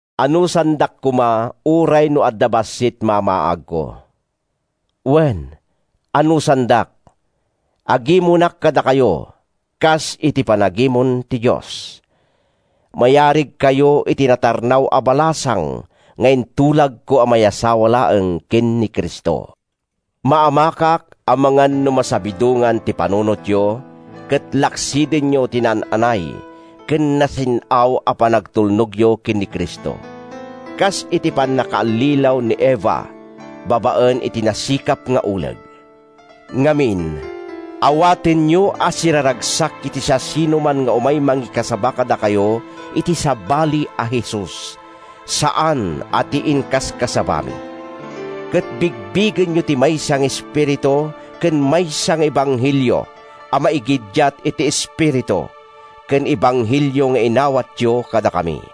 Anusandak koma uray no adda bassit mamaagko. Wen, anusandak! Agimonak kadakayo, kas iti panagimon ti Dios. Mayarigkayo iti natarnaw a balasang nga intulagko a mayasawa laeng ken ni Cristo. Maamakak amangan no masabidongan ti panunotyo ket laksidenyo ti naan-anay ken nasin-aw a panagtulnogyo ken ni Cristo—kas iti pannakaallilaw ni Eva babaen iti nasikap nga uleg. Ngamin, awatenyo a siraragsak iti siasinoman nga umay mangikasaba kadakayo iti sabali a Jesus, saan a ti inkaskasabami. Ket bigbigenyo ti maysa nga espiritu ken maysa nga ebanghelio a maigiddiat iti Espiritu ken ebanghelio nga inawatyo kadakami.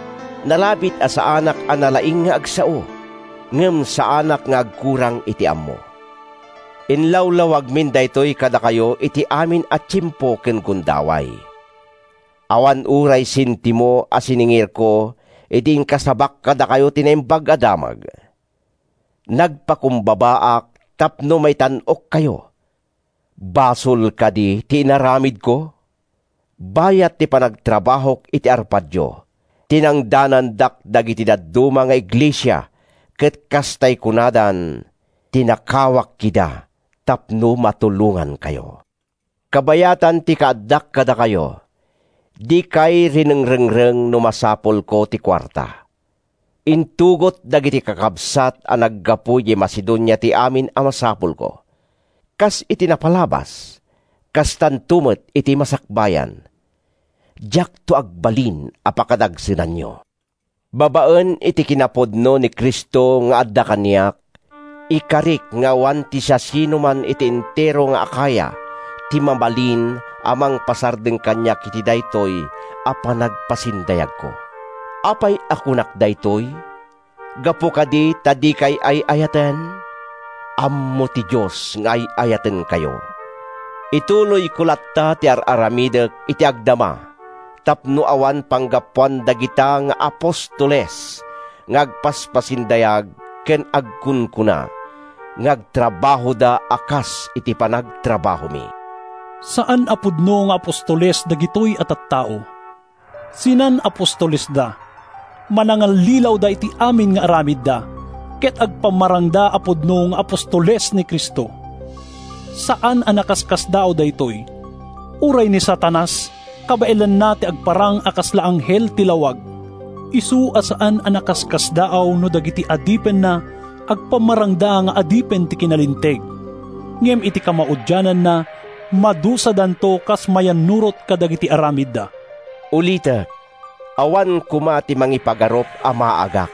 Nalabit a saanak a nalaing nga agsao, ngem saanak nga agkurang iti ammo. Inlawlawagmin daytoy kadakayo iti amin a tiempo ken gundaway. Awan uray sentimo a siningirko idi inkasabak kadakayo ti Naimbag a Damag. Nagpakumbabaak tapno maitan-okkayo. Basol kadi ti inaramidko? Bayat ti panagtrabahok iti arpadyo, tinangdanandak dagiti dadduma nga iglesia ket kas tay kunadan, tinakawak ida, tapno matulongankayo. Kabayatan ti kaaddak kadakayo, dikay rinengrengreng no masapulko ti kuarta. Intugot dagiti kakabsat a naggapu idiay Macedonia ti amin a masapulko. Kas iti napalabas, kastanto met iti masakbayan: Diakto agbalin a pakadagsenanyo! Babaen iti kinapudno ni Cristo nga adda kaniak, ikarik nga awan ti siasinoman iti entero nga Acaya ti mabalin a mangpasardeng kaniak iti daytoy a panagpasindayagko. Apay a kunak daytoy? Gapu kadi ta dikay ay-ayaten? Ammo ti Dios nga ay-ayatenkayo! Ituloyko latta ti ar-aramidek iti agdama tapno awan panggapuan dagita nga “apostoles” nga agpaspasindayag ken agkunkuna nga agtrabahoda a kas iti panagtrabahomi. Saan a pudno nga apostoles dagitoy a tattao. Sinan-apostolesda, manangallilawda iti amin nga aramidda, ket agpammarangda a pudno nga apostoles ni Cristo. Saan a nakaskasdaaw daytoy! Uray ni Satanas, kabaelanna ti agparang a kasla anghel ti lawag! Isu a saan a nakaskasdaaw no dagiti adipenna agpammarangda nga adipen ti kinalinteg. Ngem iti kamaudiananna, madusadanto kas mayannurot kadagiti aramidda. Ulitek: Awan koma ti mangipagarup a maagak.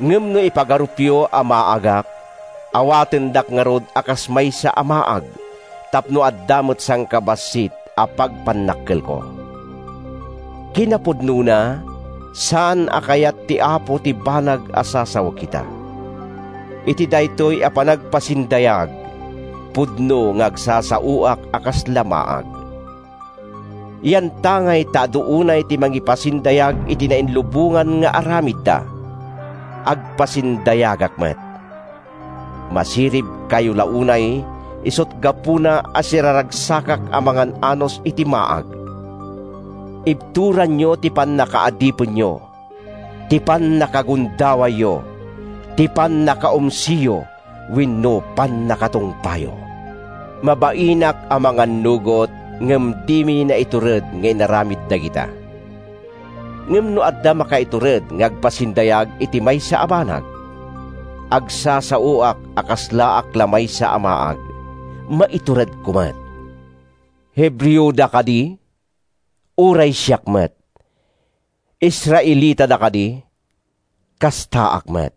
Ngem no ipagarupyo a maagak, awatendak ngarud a kas maysa a maag tapno adda met sangkabassit a pagpannakkelko. Kinapudnona, saan a kayat ti Apo ti banag a sasawek ita. Iti daytoy a panagpasindayag, pudno nga agsasaoak a kasla maag. Yantangay ta adu unay ti mangipasindayag iti nailubongan nga aramidda, agpasindayagak met. Masiribkayo la unay isut’ gapuna a siraragsakak a mangan-anus iti maag! Ibturanyo ti pannakaadipenyo, ti pannakagundawayyo, ti pannakaumsiyo wenno ti pannakatungpayo. Mabainak a mangannugot, ngem dimi naitured nga inaramid dagita! Ngem no adda makaitured nga agpasindayag iti maysa a banag—agsasaoak a kaslaak la maysa a maag—maituredko met. Hebreoda kadi? Uray siak met. Israelitada kadi? Kastaak met.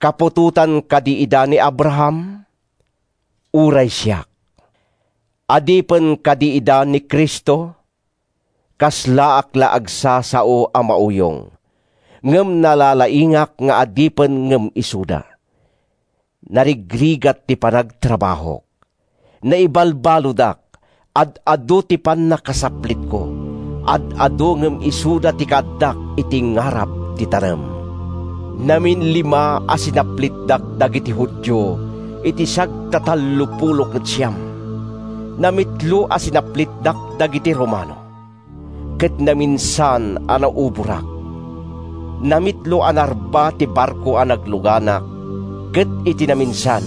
Kaputotan kadi ida ni Abraham? Uray siak. Adipen kadi ida ni Cristo? Kaslaak la agsasao a mauyong—ngem nalalaingak nga adipen ngem isuda! Narigrigat ti panagtrabahok. Naibalbaludak. Ad-adu ti pannakasaplitko. Ad-adu ngem isuda ti kaaddak iti ngarab ti tanem. Naminlima a sinaplitdak dagiti Judio iti sagtatallopulo ket siam. Namitlo a sinaplitdak dagiti Romano, ket naminsan a nauborak. Namitlo a narba ti barko a nagluganak, ket iti naminsan,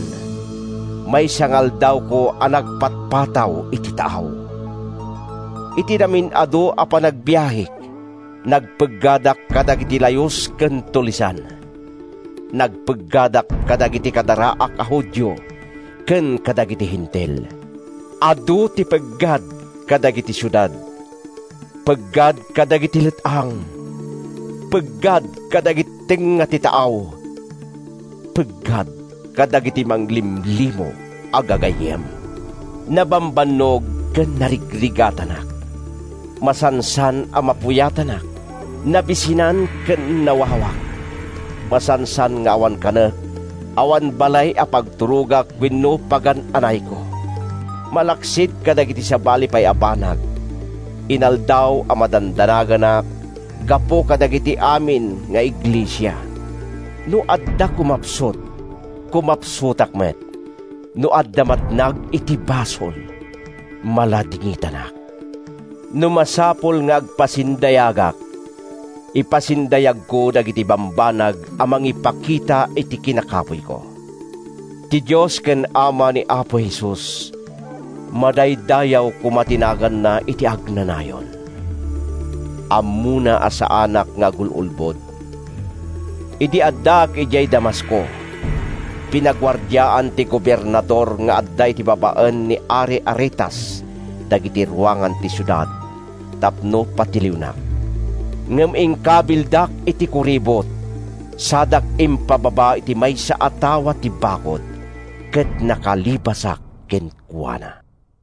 maysa nga aldawko a nagpatpataw iti taaw. Iti namin-adu a panagbiahek, nagpeggadak kadagiti layus ken tulisan. Nagpeggadak kadagiti kadaraak a Judio ken kadagiti Hentil. Adu ti peggad kadagiti siudad. Peggad kadagiti let-ang. Peggad kadagiti tengnga ti taaw. Peggad kadagiti manglimlimo a gagayyem. Nabambannog ken narigrigatanak. Masansan a mapuyatanak. Nabisinan ken nawawak. Masansan nga awan kanek, awan balay a pagturogak wenno pagan-anayko. Malaksid kadagiti sabali pay a banag, inaldaw a madandanaganak gapu kadagiti amin nga iglesia. No adda kumapsut, kumapsutak met. No adda matnag iti basol, maladingitanak. No masapul nga agpasindayagak, ipasindayagko dagiti bambanag a mangipakita iti kinakapuyko. Ti Dios ken Ama ni Apo Jesus—madaydayaw koma ti naganna iti agnanayon—ammona a saanak nga agul-ulbod. Idi addaak idiay Damasco, pinaguardiaan ti gobernador nga adda iti babaen ni ari Aretas dagiti ruangan ti siudad tapno patiliwnak. Ngem inkabildak iti kuribot sadak impababa iti maysa a tawa ti bakud, ket nakalibasak kenkuana.